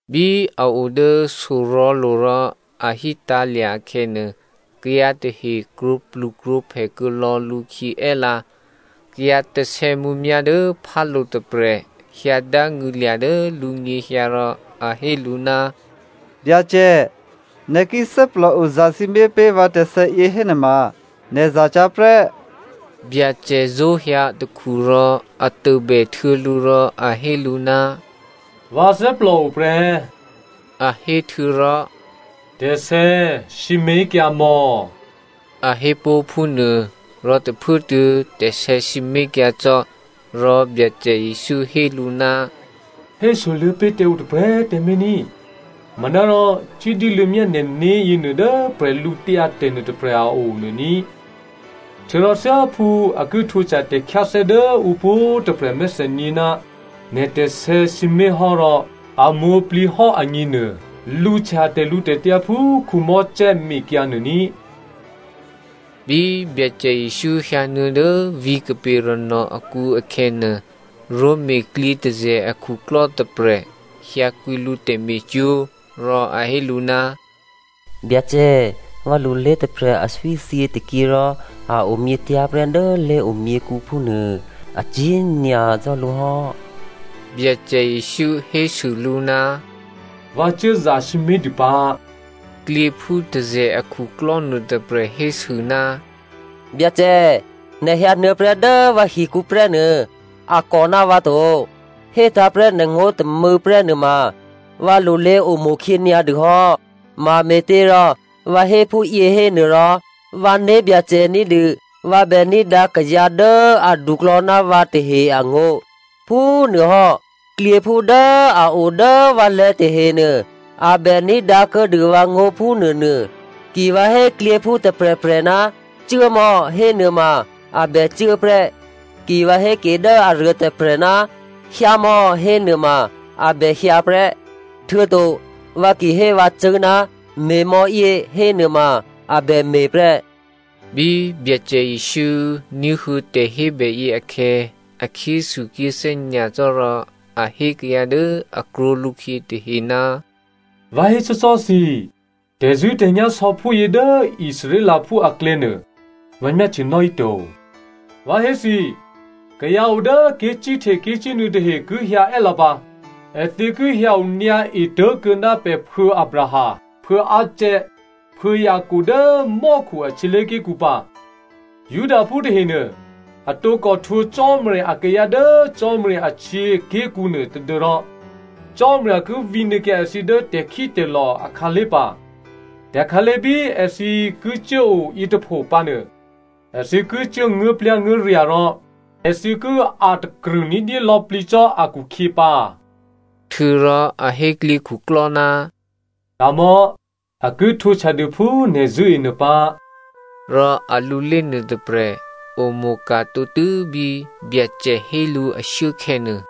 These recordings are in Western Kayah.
Bí a o dố sorò̤̌lo̤ rò a hítǎ̤lya̤ akhè̌nuô, kayǎ tahe krwǒplukrwǒphè kuô̌lò̌ lǔkhyě è́lǎ. Kayǎ tè̤sè̌mǔmyá̤ dố phálo̤ tôprè̤ hyǎ dángṳ̂lya̤ dố lǔnyěhyǎ rò a hé lǔ, “Byacè, nè̤ ki thè́plòo zasǐmé̤ pé̤ vǎ tè̤sè̌yě hénuôma, nè̤ zacyá̤ prè́.” Byacè zó̤hyǎ atakhu rò a tôbèhtuô̌ lǔ rò a hé lǔ, “Vǎ thè́plòo prè́,” a hé htuô̌rò “Tè̤sè̌꤮ sǐmé̤kyǎ mò̌,” a hé pó̤ phúnuô, rò tôphuốtuô̌ tè̤sè̌ sǐmé̤kyǎ cò́. Rò Byacè Jesǔ hé lǔ, “Hésoluô̌ pé̤ tǎ ǔ tôprè̤꤮ tǎmé̤ ní꤮, manárò cuố dyéluô̌myá nè̤né̤ yěnuô dố bwídu nuôtôprè̤ a o nuô ní꤮. Htuô̌rò thyáphú a ki htwǒhtya tè̤khyáthè́ dố ǔ pwǒ̤꤮ tôprè̤ a mèthènyě ná nè̤ tè̤sè̌ sǐmé̤hò́ rò a mwǒ̤plǐhò́ agněnuô, lǔhtya tè̤lǔtè̤tyǎ phú Mosè mekyǎ nuô ní꤮.” Bí Byacè Jesǔ hyǎnuô̌ dố vǐ̤ Capernaum akǔ akhè̌nuô, Roma klyětôzè̤ akhuklò́ tôprè̤ hyǎkwǐ lǔ tè̤me̤cwó̤. Rò a hé lǔ, “Byacè vǎlulé tôprè̤ aswí thyětôkyě rò a omyětyá̤ prè́ dố lé̤omyěkǔ phúnuô. Acyě̤ nyacò́ lǔ hò́.” Byacè Jesǔ hésû lǔ, “Vǎ cuố zasǐmé̤dû pǎ.” Klyěphú tôzè̤ akhuklò́ nuôtôprè̤ hésû, “Byacè, nè̤ hyǎnuô̌prè́ dố vǎhikǔ prè́nuô a kò ná vǎ to. Hétǎ̤prè́ nè̤ngó̤ tômû̌prè́ nuôma vǎlulé omo̤khyě nyǎdûhò́. Mame̤těrò vǎ hé phúyě hénuôrò vǎ né̤byacè ní̤dû vǎ bè ní̤dǎ kayǎ dố aduklò̌ ná vǎ tahe angó̤. Phúnuôhò́ klyěphú dố a o dố vǎlè̤̌ tahenuô a bè ní̤dǎ kuô̌dû vǎngó̤ phúnuônuô. Ki vǎ hé klyěphú tôprè̤prè̤, ‘cuốmò̌,’ hénuôma a bècuố prè́, ki vǎ hé ke dố aruôtôprè̤, ‘hyǎmò̌,’ hénuôma a bè hyǎ prè́. Htuô̌to vǎ ki hé vǎcṳ̂́, ‘me̤mò̌yě,’ hénuôma a bè me̤ prè́.” Bí Byacè Jesǔ ní̤huô̌ tè̤hébè yě akhè̌, a khyéthukhyéthè́ nyacò́ rò a hé kayǎ dố a krwǒ lǔkhyě tahe, “Vǎ hécò́cò́ thǐ, tè̤zṳ̂́tè̤nyá̤ sò̌phúyě dố Israelphú aklè̌nuô vǎ myáhtyenò́ híto. Vǎ hé thǐ, kayǎ o dố ké̤cíhte ké̤cínuô̌ tahe ki hyǎ è́lǎ pǎ. Èthǐ ki hyǎ onyǎ etố̤kuô̌ ná pè̤phuô̌ Abraham, Phuô̌ Isaac, Phuô̌ Jacob dố mò́khu a htyělé̤ké̤kǔ pǎ. Judaphú tahenuô, a tǒkò htwǒ Cò́marya akayǎ dố Cò́marya ahtyěaké̤kǔ nuô tadû́rò Cò́marya ki vǐnuô̌kyǎ èthǐ dố tè̤khítè̤lò̤ akhǎlé̤ pǎ. Tè̤khǎlé̤ bí èthǐ ki cuố o yětôpho pǎnuô, èthǐ ki cuố nguố̤plyá̤nguố̤rya̤ rò èthǐ ki a̤takrṳ̂ ní̤dyé lò̌plǐ cò́ akhukhyě pǎ.” Htuô̌rò a hé klyěkhuklò́, “Ka̤mò̌, a ki htwǒhtyadû phú nè̤ zṳ̂́e nuô pǎ.” Rò alulé nuôtôprè̤ omo̤ka̤ tǒtû́ bí Byacè hé lǔ ashuốkhè̌nuô.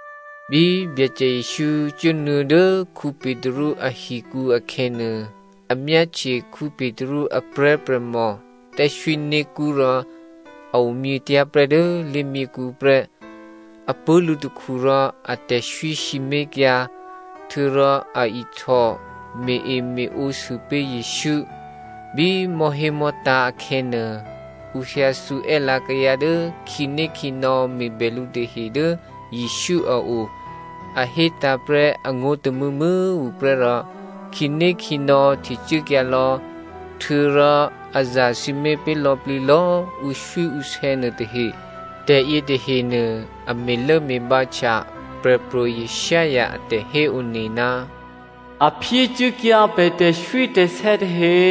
Bí Byacè Jesǔ cuốnuô̌ dố Petru ahikǔ akhè̌nuô, a myáhtye Petru a prè̤́prè̤mò thè́swíné̤kṳ́ rò a omyětyá̤ prè́ dố lé̤myěkhu prè́. A pṳ̂́ lǔtakhu rò a tè̤swí sǐmé̤kyǎ. Htuô̌rò a ihtò me̤-eme̤ǒsû pé̤ Jesǔ. Bí mò̤́hémò̤́tǎ̤ akhè̌nuô, ǔ hyǎthǔ è́lǎ kayǎ dố khǐnékhǐnò̌ me̤bè lǔ tahe dố Jesǔ a o. A hétǎ̤ prè́ angó̤ tômû̌mû̌꤮ tuô̌ prè́ rò khǐnékhǐnò̌ htecuốkyǎ lò̌. Htuô̌rò a zasǐmé̤ pé̤ lò̌plǐ lò̌꤮ ǔswíǔsè̌ nuôtahe. Tè̤ yětahenuô a me̤lốme̤bǎhtya Prè̤pro̤ Isaiah a tè̤héone, “A phyécuốkyǎ pè̤ tè̤swítè̤sè̌ tahe.”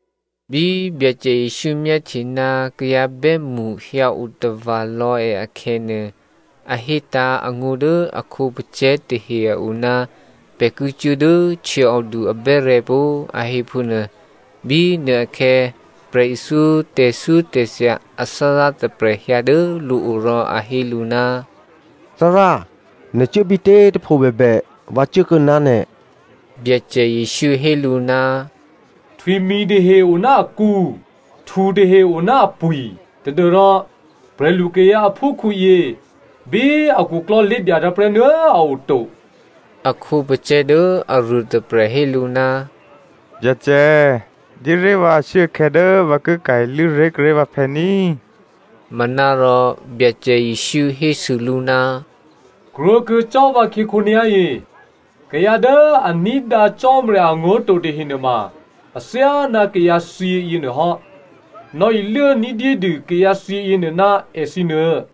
Bí Byacè Jesǔ myáhtye ná kayǎ bè́mṳ hyǎ otava̤ lò̌ è akhè̌nuô, a hétǎ̤ angó̤ dố a khǒpacè̤̌ tahe a o ná pè̤ ki cuố dố htyěòdu abè́rè̤̌ pó꤮, a hé phúnuô. Bínuôakhè̌, prè̤ithyó tè̤thyótè̤thya athárá tôprè̤ hyǎ dố lǔ o rò a hé lǔ, “Thárá, nè̤ cuố bítě꤮ tôpho bèbè, vǎ cuốkuô̌ ná nè̤.” Byacè Jesǔ hé lǔ, “Htwimi̤ tahe o ná akǔ, htutahe o ná apwi̤, tadû́rò prè̤lukayǎ aphúkhǔyě, bí akhuklò́ lé̤dyatǎ̤ prè́nuô a oto.” A khǒpacè̤̌ dố aruôtôprè̤ hé lǔ, “Byacè, dyéré̤ vǎ ashuốkhè̌ dố vǎ ki ka̤ iluố ré̤ kuốré̤ vǎphè̌ ní꤮.” Manárò Byacè Jesǔ hésû lǔ, “Krwǒkuô̌ cò́ vǎkhyě khǒnyá̤yě, kayǎ dố a ní̤dǎ Cò́marya angó̤ to tahe nuôma athyáná kayǎthyě yěnuôhò́. Nò̌iluố ní̤dyédû kayǎthyě yěnuô ná èthǐnuô.”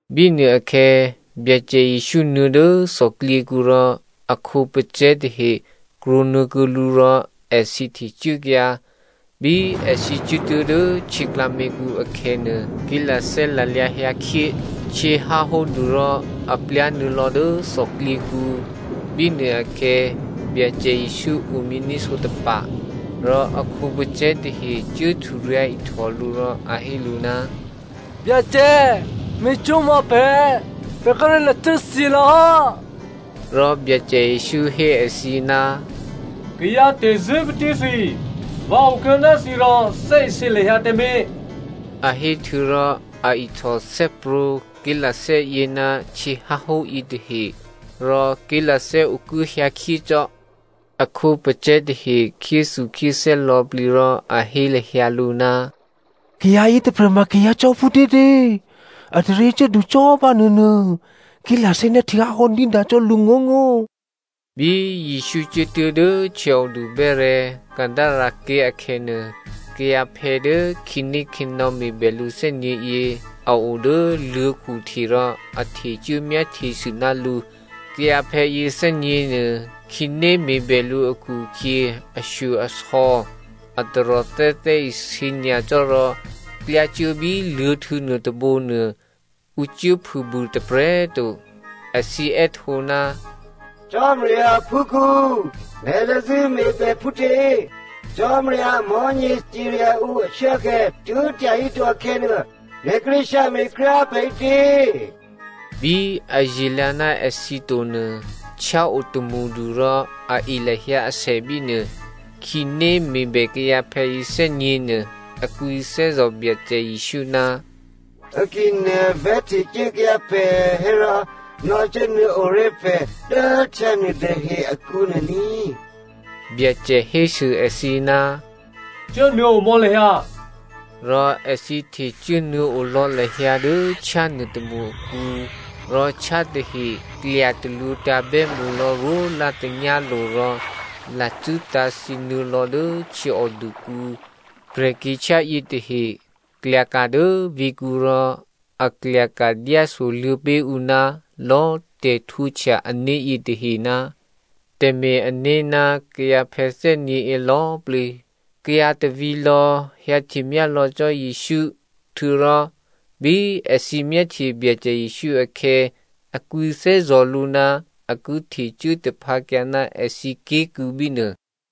Bínuôakhè̌ Byacè Jesǔ nuô̌ dố thòklyěkǔ rò a khǒpacè̤̌ tahe krwǒnuô̌ kuô̌ lǔ rò èthǐ htecuốkyǎ. Bí èthǐ cuốtuố̤ dố htyě klǎměkǔ akhè̌nuô, ké̤lathè́ lalyǎ hyǎ khyé. Htyě háhódu rò a plyá̤nuô̌ lò̌ dố thòklyěkǔ. Bínuôakhè̌ Byacè Jesǔ omyění̤ sǒtapa̤. Rò a khǒpacè̤̌ tahe cuố hturyǎ̤ihtò lǔ rò a hé lǔ, “Byacè, me̤cwó̤mò̌ pè̤, pè̤ kíré̤ lacû́thyě lò̌hò́.” Rò Byacè Jesǔ hé èthǐ, “Kayǎ tè̤zṳ̂́patí thǐ꤮, vǎ okuô̌ ná thǐ rò thè́isě lahyǎ tǎmé̤.” A héhtuô̌ rò a ihtò thè́prwǒ̤ ké̤lathè́yě ná htyěháhó yětahe. Rò ké̤lathè́ okuố hyǎkhyécò́. A khǒpacè̤̌ tahe khyéthukhyéthè́ lò̌plǐ rò a hé lahyǎ lǔ, “Kayǎ yětôprè̤ ma kayǎ cò́ phútětě? Ataryě cuốdu cò́ bánuônuô. Ké̤lathè́ ná htyěháhó ní̤dǎ cò́ lǔngó̤ngó̤.” Bí Jesǔ cuốtuố̤ dố htyěòdu bè́rè̤̌, Gadarene ké̤ akhè̌nuô, kayǎphè̌ dố khǐnékhǐnò̌ me̤bè lǔ thè́nyě̤yě a o dố luô̤̌khu hte rò a htecuố myáhtyesû ná lǔ. Kayǎphè̌ yěthè́nyě̤ nuô, khǐné me̤bè lǔ akhu-akhyě, ashyo-asò̌, a taròthè́ thè́isě nyacò́ rò klyá cuố bí luô̤̌htû̌ nuôtôbǒ nuô ǔ cuốphûbû tôprè̤꤮ to. Èthǐ è́htǒ, “Cò́marya aphúkhǔ, nè̤ thè́zṳ̂́ me̤ pè̤ phútě? Cò́marya amò̤́nyě cirya ǔ ashuốkhè̌ tuố̤ tyahíto akhè̌nuô, nè̤ kíré̤ hyǎme̤ kryá꤮ pè̤ ǐtě?” Bí aye̤lǎ ná èthǐ to nuô, htyá o tômṳdu rò a e lahyǎ asè bínuô. Khǐné me̤bè kayǎphè̌ yěthè́nyě̤ nuô, a kwǐthè́zò̤ Byacè Jesǔ, “Ki nè̤ vè̤́htecuốkyǎ pè̤ hérò, nò̌cuốnuô̌o ré̤ pè̤ dố htyá nuôtahe akǔ nuô ní꤮.” Byacè hésû èthǐ, “Cuốnuô̌omò̌ lahyǎ!” Rò èthǐ htecuố nuô̌ olò̌ lahyǎ dố htyá nuôtômṳ akǔ, rò htyá tahe klya talwǒ̤tǎ̤ bè́mṳlò̌ rwólá̤ tanyálo̤ rò lacû́ tǎ̤thyě nuô̌lò̌ dố htyěòdukǔ. Prè̤kyě̤htyá yětahe klyaka̤ dố vǐ̤kǔ rò a klyaka̤ dyásoluô̌ pé̤ ǔ ná lò̌꤮ tè̤htwǒhtya ané̤ yětahe ná tè̤me̤-ané̤ ná kayǎphè̌ thè́nyě̤yě lò̌꤮ plǐ. Kayǎ tôvǐ̤lò̌ hyǎhtemyá lò̌ cò́ Jesǔ. Htuô̌rò bí èthǐ myáhtye Byacè Jesǔ akhè̌, a kwǐthè́zò̤ lǔ ná a ki htecuố taphǎkyǎ ná èthǐ ké̤kû̌ bínuô.